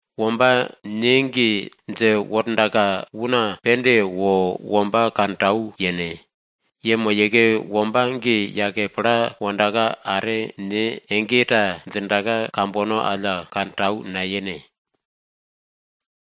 Womba ne ge dje wordaka, una pende wo womba kantau yene. Yemoyeke womba ge yake pla wondaka, are ne ege ta djindaka, kambono alla kantau nayene.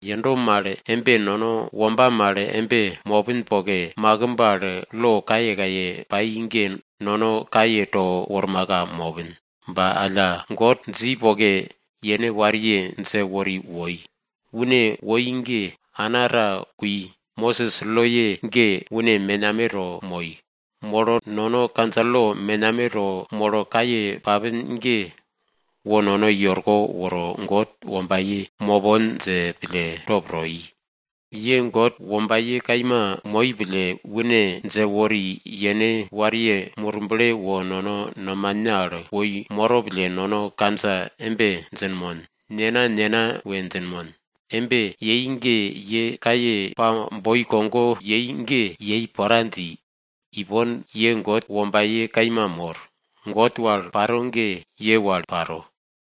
Yendo mal embe, nono womba mal embe mopin poke, makimb al lo kayekaye pai ge nono kaye to wormaka mopin. Ba alla, God dji poke, yene wariye dje wori woi. Une woi ge, ana ta kui, Mosis loye ge une menameto moi. Molo nono kandja lo menameto molo kaye papin ge, wo nono i orko woro God wombaye mopon dje pille top to i. Ye God wombaye kaima moi pille, une dje wori yene wariye Murble wo nono nomane al woi moro pille nono kandja embe djinmon, Nena, Nena we djinmon. Embe yei ge ye kaye pa boi kogo yei ge yei pora dji. Ipon ye God wombaye kaima mor, God wal paro ge ye wal paro.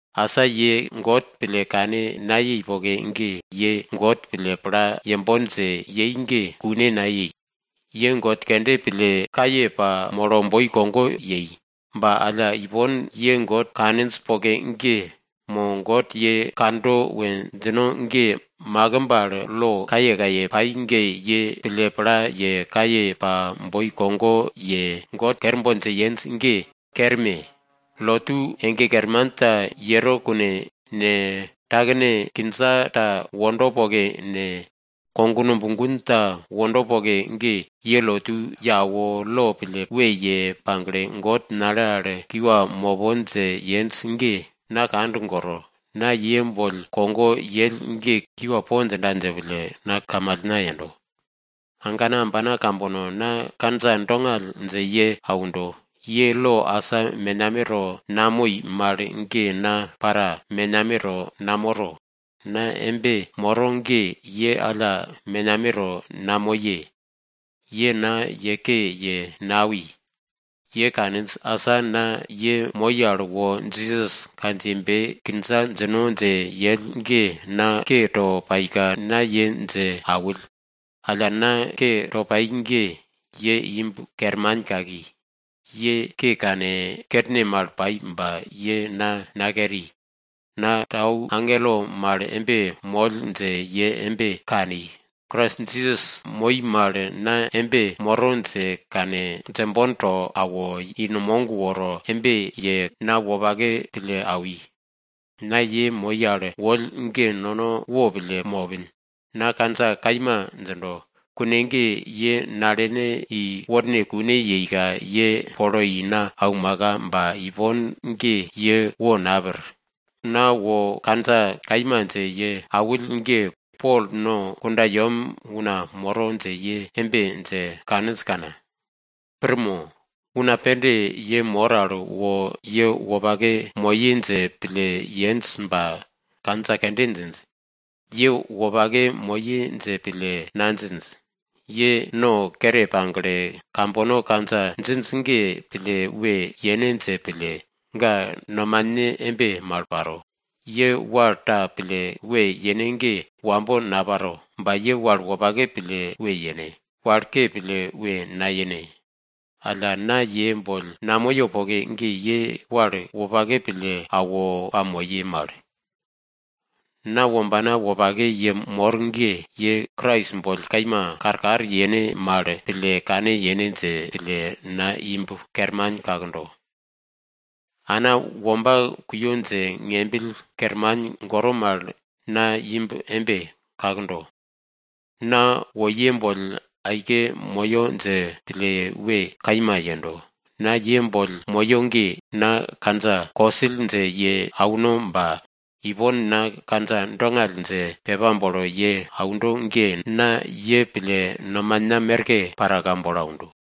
Asa ye God pille kane nayei poke ge, ye God pille pla yembon dje yei ge kune nayei. Ye god kende pille kaye pamolo boi kogo yei. Ba alla ipon ye God kaninj poke ge mo God ye kando we djino ge, makimb al lo kayekaye pai ge ye pille pla ye, kaye pa boi kogo ye, God kerbon dje yenj ge kerme! Lotu ege kerman ta yero kune ne, takene kindja ta wondo poke ne, kognumb gun ta wondo poke ge, ye lotu ye awo, lo pille we ye pagle, God nale al kiwa mopon dje yenj ge na kand goro. Na ye boll kogo yell ge, kiwa po djinda dje pille na kamalna yendo. Agana ambana kambono na kandja dongall dje ye aundo, ye lo asa menameto namoi mal ge na para menameto namoro, na embe moro ge, ye alla menameto namoye. Ye na ye ke ye nawi. Ye kaninj. Asa na ye moi al wo Jisas kandjiyebe kindja djino dje yell ge na ke to paika na ye dje awill. Alla na ke to pai ge, ye imb kerman kaki, ye ke kane, kerne mal pai ba ye na nakeri. Na tau agelo mal embe moll dje ye embe kani. Krais Jisas moi mal na embe moro dje kane, djembon to awo, i numog woro embe ye na wopake pille awi. Na ye moi al woll ge nono wopille mopin, na kandja kaima djindo, kune ge ye nalene i worne kune yeika ye polo i na aumaka, ba ipon ge ye wo napir. Na wo kandja kaima dje ye awill ge, Pol no kundayem una moro dje ye embe dje kaninj kana? Pir mo? Una pende ye mor al wo ye wopake moye dje pille yenj ba kandja kende djinj. Ye wopake moye dje pille nadjinj. Ye no kere pagle, kambono kandja djinj ge pille we yene dje pille, ga nomane embe mal paro. Ye wal ta pille we yene ge wambo naparo. Ba ye wal wopake pille we yene, wal ke pille we nayene. Alla na ye boll namoyo poke ge, ye wal wopake pille awo pamoye mal. Na wombana wopake ye mor ge! Ye Krais boll kaima karkar yene mal pille kane yene dje pille, na imb kerman kakdo. Ana womba kuyo dje ngembill kerman goro mal na imb embe kakdo. Na wo ye boll aike moyo dje pille we kaima yendo. Na ye boll moyo ge, na kandja kosill dje ye auno ba, ipon na kandja dongall dje pepa bolo ye aundo ge, na ye pille nomana merke paraka bolo aundo.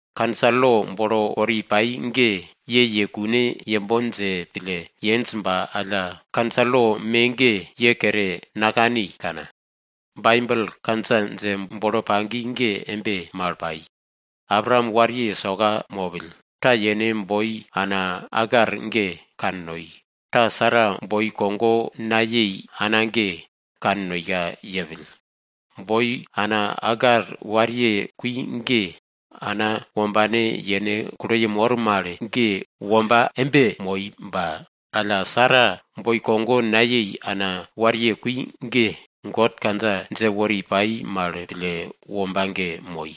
Kandja lo bolo wori pai ge ye ye kune yembon dje pille yenj ba alla, kandja lo me ge ye kere nakani kana? Baibel kandja dje bolo pagi ge embe mal pai. Abraam wariye soka mopill. Ta yene boi ana Agar ge kannoi, ta Sara boi kogo nayei ana ge kannoika yepill. Boi ana Agar wariye kui ge ana wombane yene kulo yemor mal ge womba embe moi ba alla, Sara boi kogo nayei ana wariye kui ge, God kandja dje wori pai mal pille womba ge moi.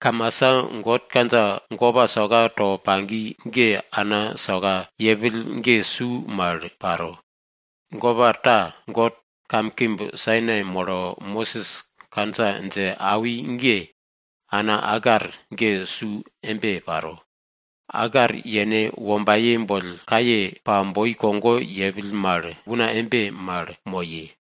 Kamasa God kandja gopa soka to pagi ge ana soka yepill ge su mal paro. Gopa ta, God kamkimb Sainai molo Mosis kandja dje awi ge, ana Agar ge su embe paro. Agar yene wombaye boll kaye pa boi kogo yepill mal una embe mal moye.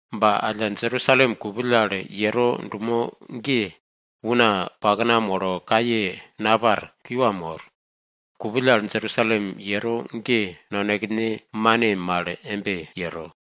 Ba alla Jerusalem kupill al yero dumo ge, una pakna molo kaye napar, kiwa mor. Kupill al Jerusalem yero ge nonekene mane mal embe yero.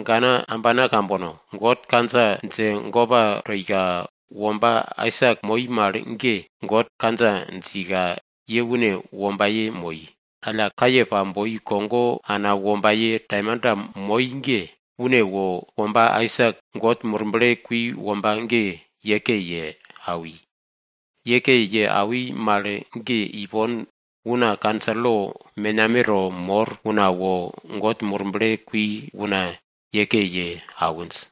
Agana ambana kambono! God kandja dje gopa toika womba Aisak moi mal ge, God kandja djika ye une wombaye moi. Alla kaye pa boi kogo ana wombaye taimanta moi ge, une wo womba Aisak God Murble kui womba ge ye ke ye awi. Ye ke ye awi mal ge, ipon una kandja lo menameto mor una wo God Murble kui una ye ke ye awinj.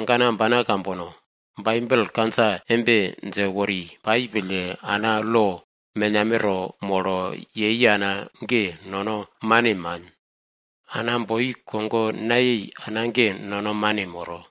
Agana ambana kambono! Baibel kandja embe dje wori pai pille, ana lo menameto molo yei ana ge nono mane man. Ana boi kogo nayei ana ge nono mane moro.